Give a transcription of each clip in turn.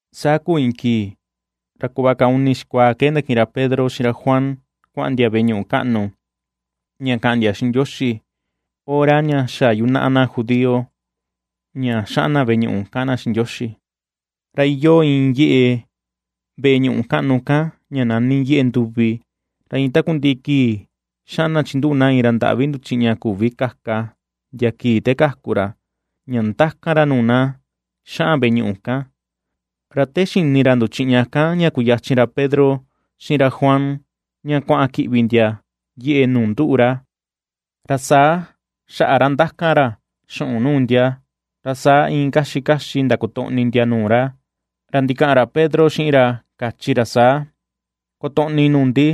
Saa kuu iin kii, ra kuꞌva kaa uni xikuaa ke ndakiꞌin ra Pedro xiꞌin ra Juan kua̱ꞌa̱n ndia veꞌe ñuꞌu kaꞌnu ña ka̱ꞌa̱n ndia xiꞌin Ndioxi, hora ña xa yunaꞌa na judío ña xaꞌan na veꞌe ñuꞌu ^kaꞌan na xiꞌin Ndioxi. Ra iyoo iin yeꞌe veꞌe ñuꞌu kaꞌnu kan ña nani Yeꞌe Nduvi, ra iin takundiꞌi kii xaꞌan na chinduꞌu na iin ra ndaꞌvi nduchiꞌña küvi kaka ndia kii te kaku ra, ña ndakan ra nuu na xaꞌan veꞌe ñuꞌu kan. Ra te xini ra nduchiꞌña kan ña kuyachin ra Pedro xiꞌin ra Juan ña kuaꞌan kiꞌvi ndia yeꞌe nuu nduꞌu ra, ra saa xaꞌa ra ndakan ra xuꞌun nuu ndia. Ra saa iin kaxi kaxi ndakotoꞌni ndia nuu ra, ra ndikaꞌan ra Pedro xiꞌin ra kachi ra saa: ―Kotoꞌni nuu ndi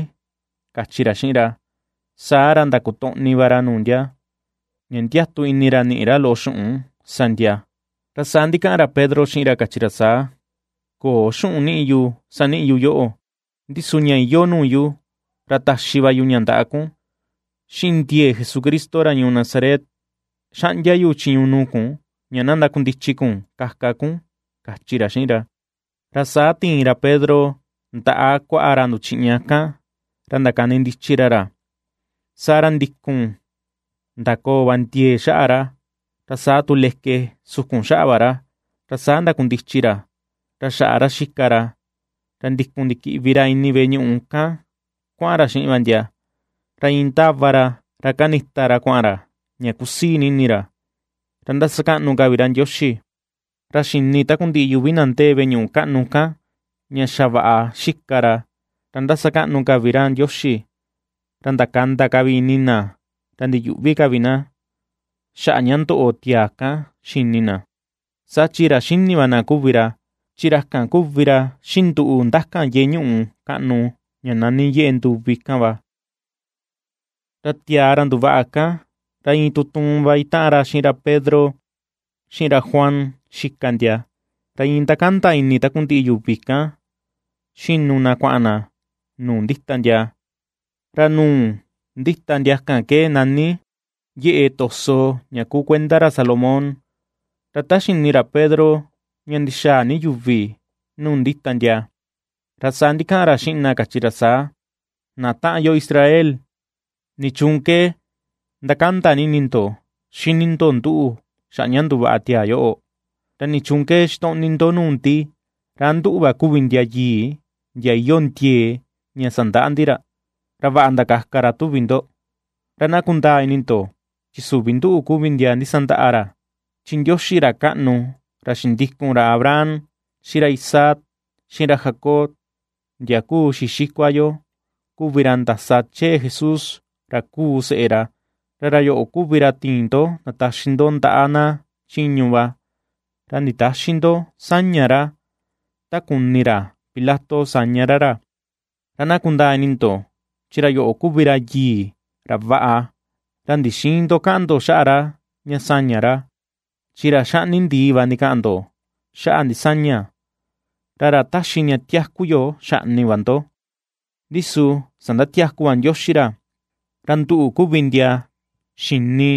―kachi ra xiꞌin ra. Saa ra ndakotoꞌni vaꞌa ra nuu ndia, ña ndiatu ini ra ni̱ꞌi̱ ra loꞌo xuꞌun sa ndia. Ra saa ndikaꞌan ra Pedro xiꞌin ra kachi ra saa: ―Köo xuꞌun niꞌi yu saniꞌi yu yoꞌo, ndi su ña iyoo nuu yu ra taxi va yu ña ndaꞌa kun: Xiꞌin ndiee Jesucristo ra ñuu Nazaret, xaꞌndia chiñu yu nuu kun ña na ndakundichi kun kaka kun ―kachi ra xiꞌin ra. Ra saa ti̱in ra Pedro ndaꞌa kuaꞌa ra nduchiꞌña kan ra ndakani ndichi ra ra, saa ra ndikun ndakoo va ndiee xaꞌa ra, ra saa tu leke sukun xaꞌa va ra. Ra saa ndakundichi ra, ra xaꞌa ra ^xika ra, ra ndikun ndikiꞌvi ra ini veꞌe ñuꞌu kan kuaꞌan ra xiꞌin va ndia, ra iin ndáva ra ra kandita ra kua̱ꞌa̱n ra, ña kusii ni ini ra, ra ^ndasakaꞌnu ka vi ra Ndioxi. Ra xi̱ni takundiꞌi yuvi na ndee veꞌe ñuꞌu kaꞌnu kan ña xa vaꞌa ^xika ra, ra ^ndasakaꞌnu ka vi ra Ndioxi. Ra ndakanda ka vi ini na ra ndiyuꞌvi ka vi na, xaꞌa ña ndoꞌo tiaa kan xini na, saa chi ra xíni̱ va na kuvi ra, chi ra kan kuvi ra xinduꞌu ndakan yeꞌe ñuꞌu kaꞌnu ña nani Yeꞌe Nduvi kan va. Ra tiaa ra ndu̱vaꞌa kan, ra iin tutuun va itaꞌan xiꞌin ra Pedro xiꞌin ra Juan xika ndia, ra iin ^ndakanda ini takundiꞌi yuvi kan, xinu na kuaꞌan na nuu ndita ndia, ra nuu ndíta ndia kan ke nani Yeꞌe to̱sò ña kuu kuenda ra Salomón. Ra ta xini ra Pedro ña ndixaa ni yuvi nuu ndita ndia, ra saa ndikaꞌan ra xiꞌin na kachi ra saa: ―Na taꞌan yo Israel, ¿nichuun ke ^ndakanda ni ini ndo xíní ndo nduꞌu xaꞌa ña ndu̱vaꞌa tiaa yoꞌo? ¿Ra nichuun ke xitoꞌni ni ndo nuu ndi ra a nduꞌu va kuvi ndia yii, ndia iyoo ndiee ña sandaꞌa ndi ra, ra vaꞌa ndakaka ra, tuvi ndo? Ra na kundaa ini ndo chi süvi nduꞌu kuvi ndia ndisandaꞌa ra. Chi Ndioxi ra kaꞌnu, ra xindikun, ra Abraham, xiꞌin ra Isaac, xiꞌin ra Jacob ndia kuu xii xikua yo, kuvi ra ndasa chee Jesús ra kuu seꞌe ra, ra ra yoꞌo kuvi ra tiin ndo ndataxi ndo ndaꞌa na chiñu va, ra nditäxi ndo sa̱ña̱ ra, ta kuni ra Pilato ña sa̱ñá ra ra. Ra na kundaa ini ndo chi ra yoꞌo kuvi ra yii, ra vaꞌa, ra ndixïin ndo kaꞌan ndo xaꞌa ra ña saña ra. ¡Chi ra xaꞌni ndii va ndikaꞌan ndo xaꞌa ndisaña, ra ra ^taxi ña tiaku yo xaꞌni va ndo! Ndi su sandatiaku va Ndioxi ra, ra nduꞌu kuvi ndia xini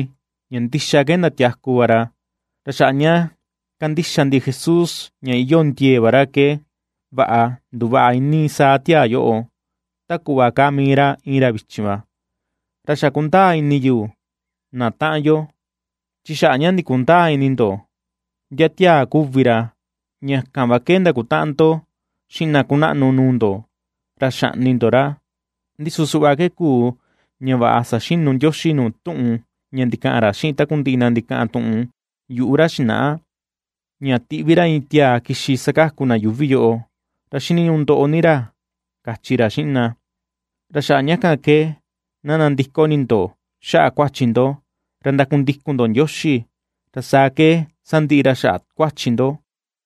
ña ndixa ke ndatiaku va ra. Ra xaꞌa ña ^kandixa ndi Jesús ña iyoo ndiee va ra ke, vaꞌa nduvaꞌa iinii saa tiaa yoꞌo, ta kuꞌva kaa mii ra iin ra vichin va. ’Ra xa kundaa ini yu, na taꞌan yo, chi xaꞌa ña ndikundäa ini ndo ndia tiaa kuvi ra ña kan va ke ndakutaꞌan ndo xiꞌin na kunaꞌnu nuu ndo ra xaꞌni ndo ra. Ndi su suꞌva ke kuu, ña vaꞌa saxinu Ndioxi nuu tuꞌun ña ndikaꞌan ra xiꞌin takundiꞌi na ndikaꞌan tuꞌun yuꞌu ra xinaꞌa, ña tiꞌvi ra iin tiaa kixi sakaku na yuuvi yoꞌo, ra xiniñuꞌu ndoꞌo ni ra kachi ra xiꞌin na. Ra xaꞌa ña kan ke na nandiko ini ndo xaꞌa kuachi ndo, ra ndakundikun ndo Ndioxi, ra saa ke sandiꞌi ra xaꞌa kuachi ndo.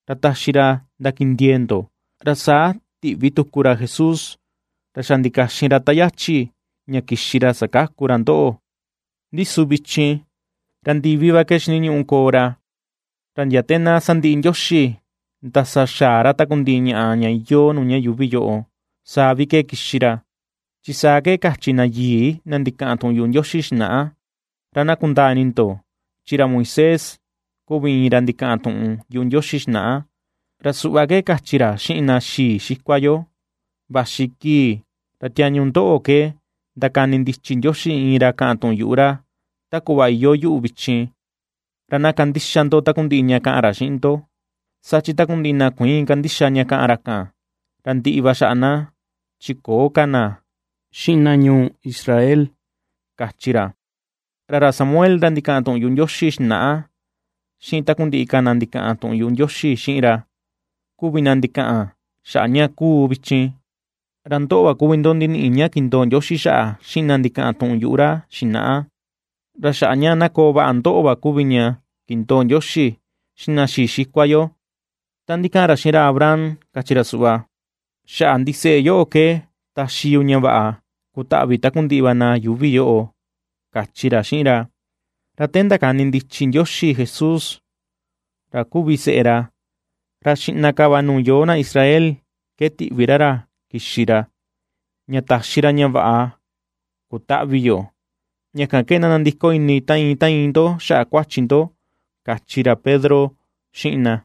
Ra taxi ra ndakindiee ndo, ra saa tiꞌví tuku ra Jesús, ra xa ndikaxin ra ta yachi ña kixi ra sakaku ra ndoꞌo. Ndi su vichin ra ndivi va ke xiniñuꞌu koo ra, ra ndia te na sandiꞌi Ndioxi ndasaxa̱á ra takundiꞌi ñaꞌa ña iyoo nuu ña yuuvi yoꞌo, saa vi ke kixi ra, chi saa ke kachi na yii, na ndikaꞌan tuꞌun yuꞌu Ndioxi xinaꞌa. Ra na kundaa ini ndo chi ra Moisés kuvi iin ra ndikaꞌan tuꞌun yuꞌu Ndioxi xinaꞌa, ra suꞌva ke kachi ra xiꞌin na xii xikua yo: “Vaxi kii ra tiañu ndoꞌo ke ndakani ndichi Ndioxi iin ra kaꞌan tuꞌun yuꞌu ra, ta kuꞌva iyoo yuꞌu vichin. Ra na kandixa ndo takundiꞌi ña ka̱ꞌa̱n ra xiꞌin ndo, Saa chi takundiꞌi na kuïin kandixa ña ^kaꞌan ra kan, ra ndiꞌi va xaꞌa na chi köo ka na xiꞌin na ñuu Israel”, kachi ra. ’Ra ra Samuel ra ndikaꞌan tuꞌun yuꞌu Ndioxi xinaꞌa xiꞌin takundiꞌi ka na ndikaꞌan tuꞌun yuꞌu Ndioxi xiꞌin ra, kuvi na ndikaꞌan xaꞌa ña kuu vichin. Ra ndoꞌo va kuvi ndo ndiniꞌi ña kindoo Ndioxi xaꞌa xiꞌin na ndikaꞌan tuꞌun yuꞌu ra xinaꞌa, ra xaꞌa ña na koo vaꞌa ndoꞌo va kuvi ña kindoo Ndioxi xiꞌin na xii xikua yo, ta ndikaꞌan ra xiꞌin ra Abraham kachi ra suꞌva: “Xaꞌa ndiseꞌe yoꞌo ke taxi yu ña vaꞌa kutaꞌvi takundiꞌi va na yuuvi yoꞌo”, kachi ra xiꞌin ra. Ra te ndakani ndichi Ndioxi Jesús ra kuvi seꞌe ra, ra xiꞌna ka va nuu yoo na Israel ke ^tiꞌvi ra ra kixi ra, ña taxi ra ña vaꞌa kutaꞌvi yo, ña kan ke na nandiko ini ta iin ta iin ndo xaꞌa kuachi ndo ―kachi ra Pedro xiꞌin na.